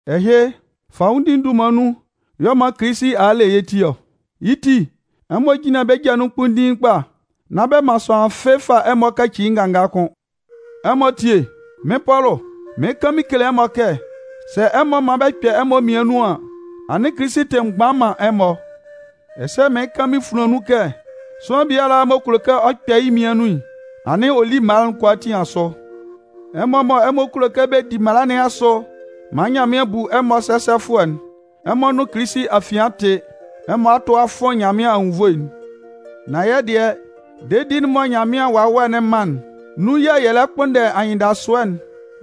Ɛhɩ, fanwʋndi'n dunman nun y'ɔ man Kilisi a a le yɛ́ ti ɔ. Yɩ́ ti, ɛmɔ jínlan bɛ́ ja nun kpunndiin kpa, nán bɛ man sʋanlan fɩ́ɩ́ fa ɛmɔ kaci yɩ́ nganga kʋ́n. Ɛmɔ tíe, mɩ́n Pɔlʋ, mɩɩn kan mɩn kele ɛmɔ kɛ, sɛ ɛmɔ man bɛ kpɛ ɛmɔ mmian nun an, anɩn Kilisi tɩ mgban man ɛmɔ. Ɛsɛ mɩɩn kan mɩn funlan nun kɛ, sʋanlan biala m'ɔ kulo kɛ ɔ kpɛ yɩ́ mmian nun'n, anɩn ɔ lí mala'n kʋalaatin asʋ. Ɛmɔ mɔ ɛmɔ kulo kɛ bɛ di mala nɩn asʋ maan Nyanmɩan bu ɛmɔ sɛsɛfʋɛ'n, ɛmɔ nʋn Kilisi afian a tɩ. Ɛmɔ a tʋ a fʋn Nyanmɩan anwunnvoe'n. Nan yɛ́ dɩɛ, dedi'n mɔ Nyanmɩan Wawɛ'n man'n, nun yɛ̂ yɛ lɛ kpʋnndɛ anyɩndasʋɛ'n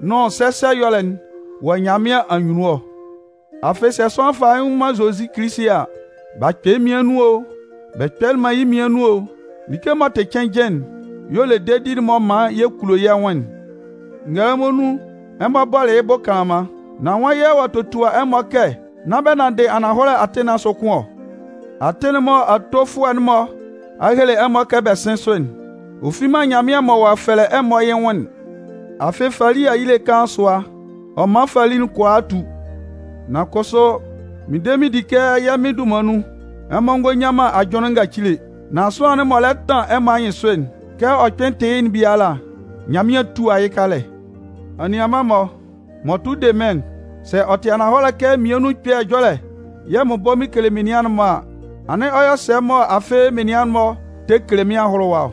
nʋn sɛsɛ ɛyɔlɛ'n wɔ Nyanmɩan anyunnun ɔ. Afɩ sɛ sʋanlan fa yɩ́ nwʋn man Zozi Kilisi a, b'a kpɛ yɩ́ mmian nun o, bɛ kpɛlɩ man yɩ́ mmian nun o, like m'ɔ tɩ cɩnnjɩn'n y'ɔ le dedi'n m'ɔ man yɛ kulo yɛ́ nwʋn'n. Ngɛlɛmɔ nun, ɛmɔ bɔlɩ yɩ́ bʋ kanlanman. Nan nwan yɛ̂ ɔ'a totua ɛmɔ kɛ nán bɛ nanndɩ ananhɔlɛ atɩn nɩn asʋ kʋ́n ɔ? Atɩn'n mɔ atofʋɛ'n-mɔ a hele ɛmɔ kɛ bɛ sɩ́n sʋ'n, ɔ fi man Nyanmɩan m'ɔ ɔ'a fɛlɛ ɛmɔ yɩ́ nwʋn'n. Afɩ fali ayile kaan sʋa, ɔ man fali'n kʋalaa tu. Nan kʋsʋ, mɩn de mɩn di kɛ yɛ́ Mɩn dunman nun, ɛmɔ ngɔ nyan man ajʋnlɩn ngacile. Nan sʋanlan'n m'ɔ lɛ tan ɛmɔ anyɩnsʋ'n, kɛ ɔ kpɩn tɩ yɩ́'n biala, Nyanmɩan 'tua yɩ́ kalɛ. Anianman-mɔ, m'ɔ tʋ de mɩ́n'n, sɛ ɔ tɩ ananhɔlɛ kɛ mmian nun ɛkpɛ ɛjɔlɛ yɛ̂ mɩn bɔ mɩn kele menian'n-mɔ a, anɩn ɔ yɔ sɛ mɔ afɩ menian'n-mɔ tɛ kele mɩ́n ahʋlʋwa ɔ?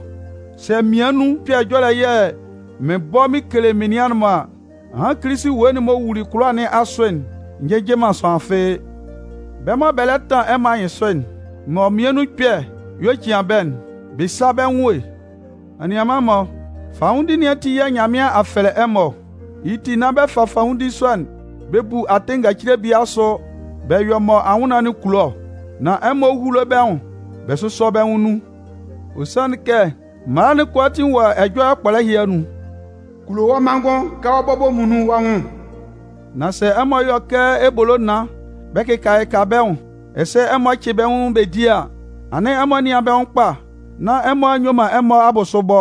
Sɛ mmian nun ɛkpɛ ɛjɔlɛ yɛ̂ mɩn bɔ mɩn kele menian'n-mɔ a, ahan Kilisi ewue'n m'ɔ wuli kʋlʋwa nɩn asʋ'n njɩjɩ man sʋanlan fɩ́ɩ́. Bɛ́ mɔ bɛ lɛ tan ɛmɔ anyɩnsʋ'n, mɔ mmian nun ɛkpɛ y'ɔ cian bɛ́'n, bɛ sá bɛ́ nwʋn e! Anianman-mɔ, fanwʋndi nɩn ati yɛ̂ Nyanmɩan a fɛlɛ ɛmɔ ɔ. Yɩ́ ti, nán bɛ fa fanwʋndi sɔ'n bɛ bu atɩn ngacile bie asʋ bɛ yɔ mɔ anwʋnnaan'n kulo ɔ. Nan ɛmɔ húlo bɛ́ nwʋn bɛ sʋ́sɔ bɛ́ nwʋn nun. Ɔ sanlɩn kɛ, mala'n kʋalaatin wɔ ɛjɔlɛ kpɔlɛ ɛhɩ anun: “Kulo wɔ́ manngʋn kɛ wɔ́ bɔbɔ muonun wɔ́ nwʋn.” Nan sɛ ɛmɔ yɔ kɛ ebolo naan bɛ kɩka kɩka bɛ́ nwʋn, ɛsɛ ɛmɔ cɩ bɛ́ nwʋn bɛ di a, anɩn ɛmɔ nɩ́an bɛ nwʋn kpa nán ɛmɔ a nyue man ɛmɔ abʋsʋ bɔ.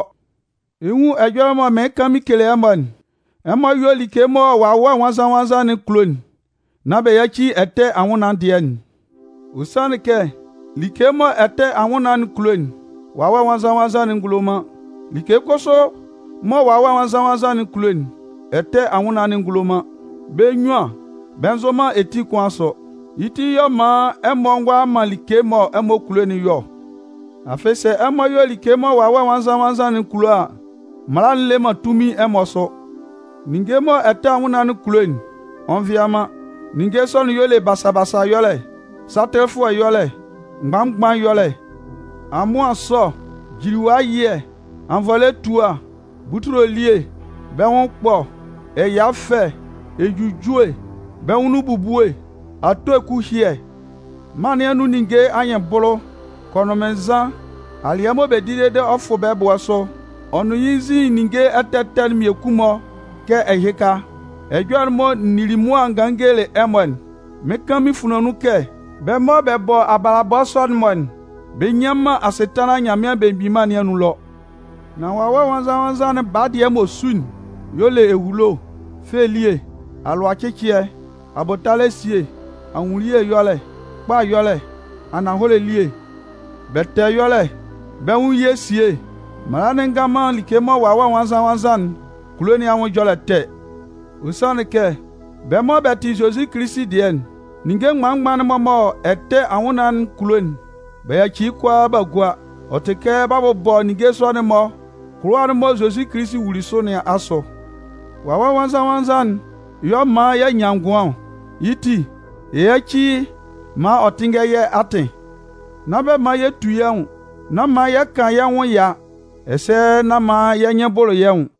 Ɛ 'nwun ɛjɔlɛ mɔ mɩɩn kan mɩn kele ɛmɔ'n: Ɛmɔ yɔ́ like mɔ Wawɛ Nwannzan-nwannzan'n kulo'n nán bɛ yáci ɛtɛ anwʋnnaan'n dɩɛ'n. Ɔ sanlɩn kɛ, like mɔ ɛtɛ anwʋnnaan'n kulo'n, Wawɛ Nwannzan-nwannzan'n ngulo man. Like kʋsʋ mɔ Wawɛ Nwannzan-nwannzan'n kulo'n, ɛtɛ anwʋnnaan'n ngulo man. Bɛ́ munnyuan bɛ nzʋn man etin kʋn asʋ. Yɩ́ ti y'ɔ man ɛmɔ ngʋala man like mɔ ɛmɔ kulo'n yɔ ɔ. Afɩ sɛ ɛmɔ yɔ like mɔ Wawɛ Nwannzan-nwannzan'n kulo a, mala'n le man tunmin ɛmɔ sʋ. Ninnge'n mɔ ɛtɛ anwʋnnaan'n kulo'n, ɔ nvɩa man. Ninnge sɔ'n y'ɔ le basa basa ɛjɔlɛ, satɩlɩfʋɛ ɛyɔlɛ, mgban-mgban ɛyɔlɛ, amʋan ɛsɔ, jiliwa ɛyɩɛ, anvɔlɛ etua, butule elie, bɛ́ nwʋn ɛkpɔ, ɛya ɛfɛ, ejujue, bɛ́ nwʋn nun ebubue, ato eku ɛhyɩɛ mân nɩn anun ninnge anyɩnbʋlʋ, kɔnʋnmɩnnzan, alɩɛ mɔ bɛ di dede ɔ fʋ bɛ́ ɛbʋɛ sʋ ɔ nʋn yɩ́ nzin ninnge ɛtɛ ɛtɛ mmiekun-mɔ kɛ ɛhɩka. Ɛjɔlɛ'n mɔ n nili mʋa n ganlɩn n gelelɩ ɛmɔ'n, mɩɩn kan mɩn funlan nun kɛ, bɛ́ mɔ bɛ bɔ abalabɔ sɔ'n-mɔ'n, bɛ nnyan man asɩtanlan Nyanmɩan Belemgbin Mân nɩn anun ɛlɔ. Nan Wawɛ Nwannzan-nwannzan'n baa dɩɛ m'ɔ su'n y'ɔ le ehulo, fɛ elie, alʋacɩcɩɛ, abʋtalɛ esie, ahunnunye ɛyɔlɛ, kpa ɛyɔlɛ, ananhɔlɛ elie bɛtɛɛ ɛyɔlɛ, bɛ́ nwʋn ye esie. Mala'n ngan man like mɔ Wawɛ Nwannzan-nwannzan'n kulo nɩn anwʋn ɛjɔlɛ ɛtɛ. Ɔ sanlɩn kɛ bɛ́ mɔ bɛ tɩ Zozi Kilisi dɩɛ'n, ninnge mgban mgban'n-mɔ mɔ ɛtɛ anwʋnnaan'n kulo'n, b'a yaci yɩ́ kʋalaa b'a gua. Ɔ tɩ kɛ b'a bʋbɔ ninnge sɔ'n-mɔ kʋlʋwa'n mɔ Zozi Kilisi wuli sʋ nɩn asʋ. Wawɛ Nwannzan-nwannzan'n y'ɔ man y'a nyan ngʋan ɔ. Yɩ́ ti, yɛ yáci yɩ́ maan ɔ tɩ́nngɛ yɛ́ atɩn. Nán bɛ man yɛ tu yɛ́ nwʋn, nán man yɛ kan yɛ́ nwʋn ɛya, ɛsɛ nán man yɛ́ nyɩn bʋlʋ yɛ́ nwʋn.